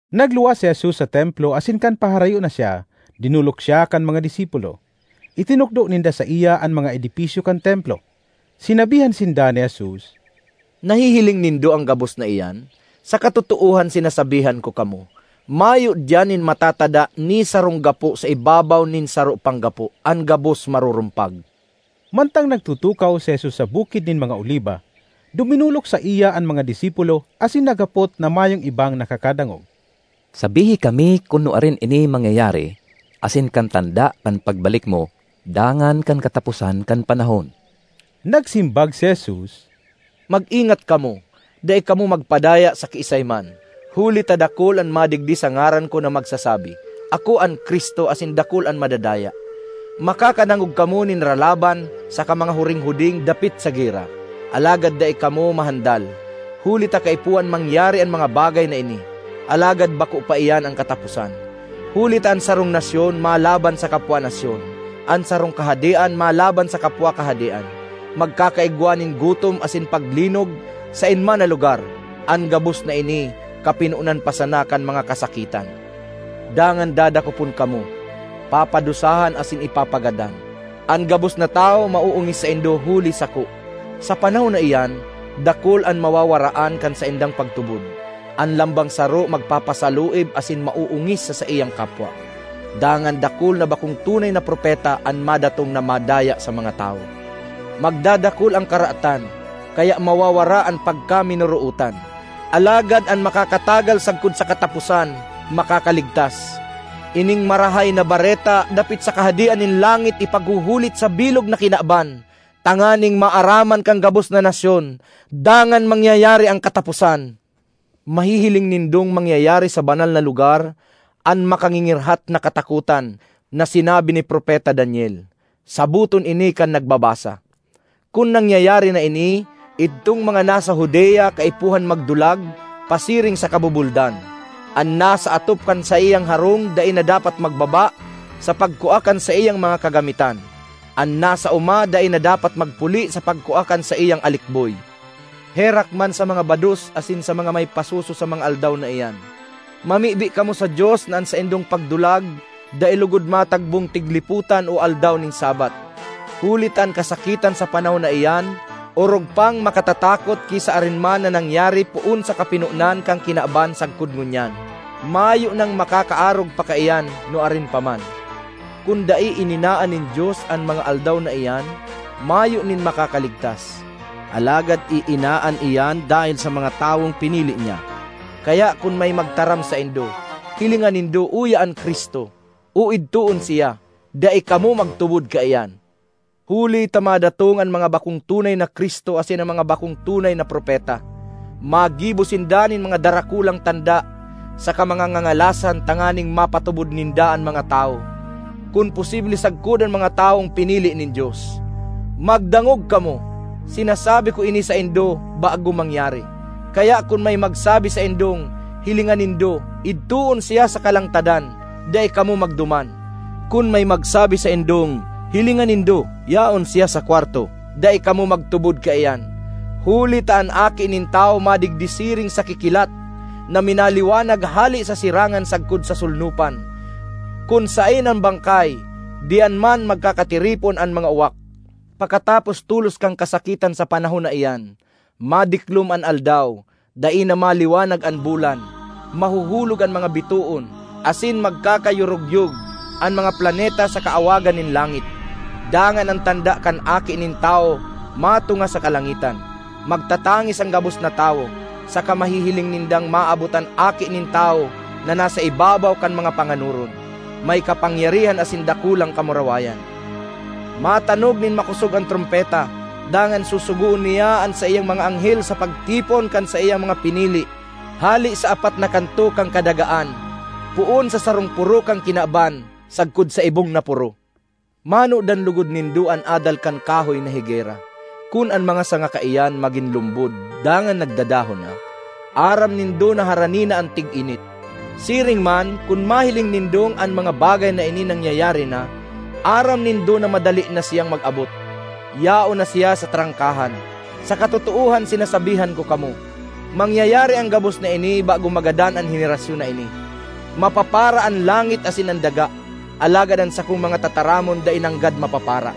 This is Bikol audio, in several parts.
Nagluwas si Jesus sa Templo asin kan paharayo na siya, dinolok siya kan mga disipulo. Itinukdo ninda saiya an mga edipisyo kan Templo. Sinabihan sinda ni Jesus, “Nahihiling nindo an gabos na iyan? Sa katotoohan sinasabihan ko kamo, mayo diyan nin matatada ni sarong gapo sa ibabaw nin saro pang gapo; an gabos marurumpag.” Mantang nagtutukaw si Jesus sa Bukid nin mga Oliba, duminolok saiya an mga disipulo asin naghapot na mayong ibang nakakadangog, “Sabihi kami kun nuarin ini mangyayari asin kan tanda kan pagbalik mo dangan kan kataposan kan panahon.” Nagsimbag si Jesus, “Mag-ingat kamo; dai kamo magpadaya sa kiisay man. Huli ta dakul an madigdi sa ngaran ko na magsasabi, ‘Ako an Cristo,’ asin dakul an madadaya. Makakadangog kamo nin ralaban saka mga huringhuding dapit sa gera. Alagad dai kamo mahandal, huli ta kaipuhan mangyari an mga bagay na ini, alagad bako pa iyan an kataposan. Huli ta an sarong nasyon malaban sa kapwa nasyon; an sarong kahadean malaban sa kapwa kahadean. Magkakaigwa nin gutom asin paglinog saen man na lugar. An gabos na ini kapinonan pa sana kan mga kasakitan. ”Dangan dadakopon kamo, papadusahan asin ipapagadan. An gabos na tawo maoongis saindo huli sako. Sa panahon na iyan, dakul an mawawaraan kan saindang pagtubod; an lambang saro magpapasaluib asin maoongis sa saiyang kapwa. Dangan, dakul na bakong tunay na propeta an madatong na madaya sa mga tawo. Magdadakul an karatan, kaya mawawara an pagkaminorootan. Alagad an makakatagal sagkod sa kataposan, makakaligtas. Ining Marahay na Bareta dapit sa Kahadean nin langit ipaghuhulit sa bilog na kinaban, tanganing maaraman kan gabos na nasyon; dangan mangyayari an kataposan. ”Mahihiling nindong mangyayari sa banal na lugar ‘An Makangingirhat na Katakotan,’ na sinabi ni Propeta Daniel.” (Saboton ini kan nagbabasa!) ”Kun nangyayari na ini, idtong mga nasa Judea kaipuhan magdulag pasiring sa kabubuldan. An nasa atop kan saiyang harong dai na dapat magbaba sa pagkua kan saiyang mga kagamitan. An nasa oma dai na dapat magpuli sa pagkua kan saiyang alikboy. Herak man sa mga bados asin sa mga may pasoso sa mga aldaw na iyan! Mamibi kamo sa Dios na an saindong pagdulag dai logod matagbong tiglipotan o aldaw nin Sabbath! Huli ta an kasakitan sa panahon na iyan orog pang makatatakot ki sa arin man na nangyari poon sa kapinonan kan kinaban sagkod ngunyan. Mayo nang makakaarog pa kaiyan nuarin pa man. Kun dai ininaan nin Dios an mga aldaw na iyan, mayo nin makakaligtas; alagad iinaan iyan dahel sa mga tawong pinili niya. ”Kaya kun may magtaram saindo, ‘Hilinga nindo, uya an Cristo!’ o ‘Idtoon siya!’—dai kamo magtubod kaiyan. Huli ta madatong an mga bakong tunay na Cristo asin an mga bakong tunay na propeta. Magibo sinda nin mga darakulang tanda saka mga ngangalasan tanganing mapatubod ninda an mga tawo, kun posible sagkod an mga tawong pinili nin Dios. Magdangog kamo! Sinasabi ko ini saindo bago mangyari. ”Kaya kun may magsabi saindong, ‘Hilinga nindo, idtoon siya sa kalangtadan!’—dai kamo magduman; kun may magsabi saindong, ‘Hilinga nindo, yaon siya sa kwarto!’—dai kamo magtubod kaiyan. Huli ta an Aki nin Tawo madigdi siring sa kikilat na minaliwanag hale sa sirangan sagkod sa solnopan. ”Kun saen an bangkay, diyan man magkakatiripon an mga uwak. ”Pakatapos tolos kan kasakitan sa panahon na iyan, madiklom an aldaw, dai na maliwanag an bulan, mahuhulog an mga bitoon, asin magkakayorogyog an mga planeta sa kaawagan nin langit. Dangan an tanda kan Aki nin Tawo matunga sa kalangitan; magtatangis an gabos na tawo, saka mahihiling nindang maabot an Aki nin Tawo na nasa ibabaw kan mga panganoron, may kapangyarihan asin dakulang kamurawayan. Matanog nin makosog an trompeta, dangan susugoon niya an saiyang mga anghel sa pagtipon kan saiyang mga pinili hale sa apat na kanto kan kadagaan, poon sa sarong poro kan kinaban sagkod sa ibong na poro. ”Manodan logod nindo an adal kan kahoy na higera. Kun an mga sanga kaiyan magin lumbod dangan nagdadahon na, aram nindo na harani na an tiginit. Siring man, kun mahiling nindong an mga bagay na ini nangyayari na, aram nindo na madali na siyang mag-abot; yaon na siya sa trangkahan. Sa katotoohan sinasabihan ko kamo, mangyayari an gabos na ini bago magadan an henerasyon na ini. Mapapara an langit asin an daga, alagad an sakong mga tataramon dai nanggad mapapara.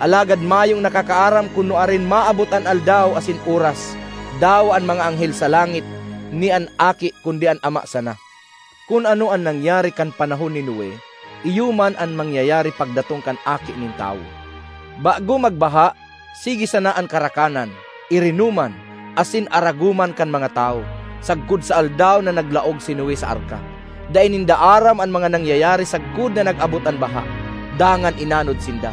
”Alagad mayong nakakaaram kun nuarin maabot an aldaw asin oras; dawa an mga anghel sa langit ni an Aki, kundi an Ama sana. Kun ano an nangyari kan panahon ni Noe iyo man an mangyayari pagdatong kan Aki nin Tawo. Bago magbaha, sige sana an karakanan, irinoman, asin aragoman kan mga tawo, sagkod sa aldaw na naglaog si Noe sa arka. Dai ninda aram an mga nangyayari sagkod na nag-abot an baha dangan inanod sinda.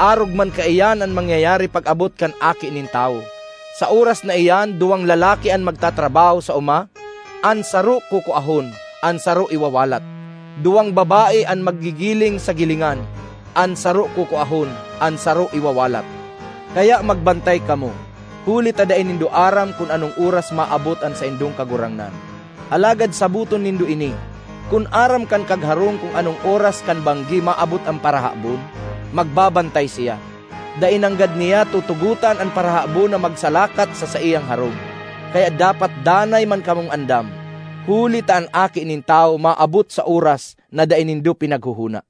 Arog man kaiyan an mangyayari pag-abot kan Aki nin Tawo. Sa oras na iyan duwang lalaki an magtatrabaho sa oma; an saro kukuahon, an saro iwawalat. Duwang babae an maggigiling sa gilingan; an saro kukuahon, an saro iwawalat. Kaya magbantay kamo, huli ta dai nindo aram kun anong oras maabot an saindong Kagurangnan. Alagad saboton nindo ini! Kun aram kan kagharong kun anong oras kan banggi maabot an parahabon, magbabantay siya. Dai nanggad niya tutugotan an parahabon na magsalakat sa saiyang harong. Kaya dapat danay man kamong andam, huli ta an Aki nin Tawo maabot sa oras na dai nindo pinaghohona.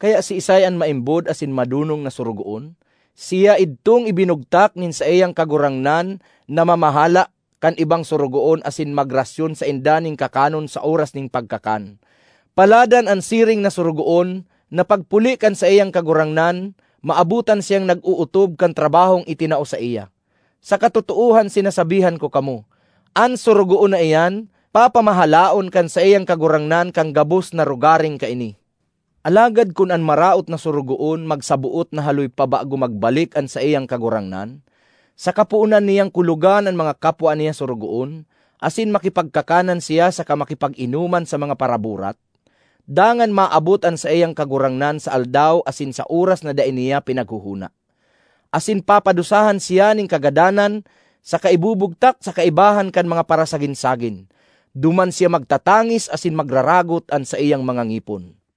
”Kaya siisay an maimbod asin madonong na sorogoon? Siya idtong ibinugtak nin saiyang kagurangnan na mamahala kan ibang sorogoon asin magrasyon sainda nin kakanon sa oras nin pagkakan. Paladan an siring na sorogoon na pagpuli kan saiyang kagurangnan, maabotan siyang nag-ootob kan trabahong itinao saiya. Sa katotoohan sinasabihan ko kamo, an sorogoon na iyan papamahalaon kan saiyang kagurangnan kan gabos na rogaring kaini. Alagad kun an maraot na sorogoon magsaboot na haloy pa bago magbalik an saiyang kagurangnan, saka poonan niyang kulogan an mga kapwa niya sorogoon, asin makipagkakanan siya saka makipag-inoman sa mga paraburat; dangan maabot an saiyang kagurangnan sa aldaw asin sa oras na dai niya pinaghohona, asin papadusahan siya nin kagadanan saka ibubugtak sa kaibahan kan mga parasagin-sagin. Duman siya magtatangis asin magraragot an saiyang mga ngipon.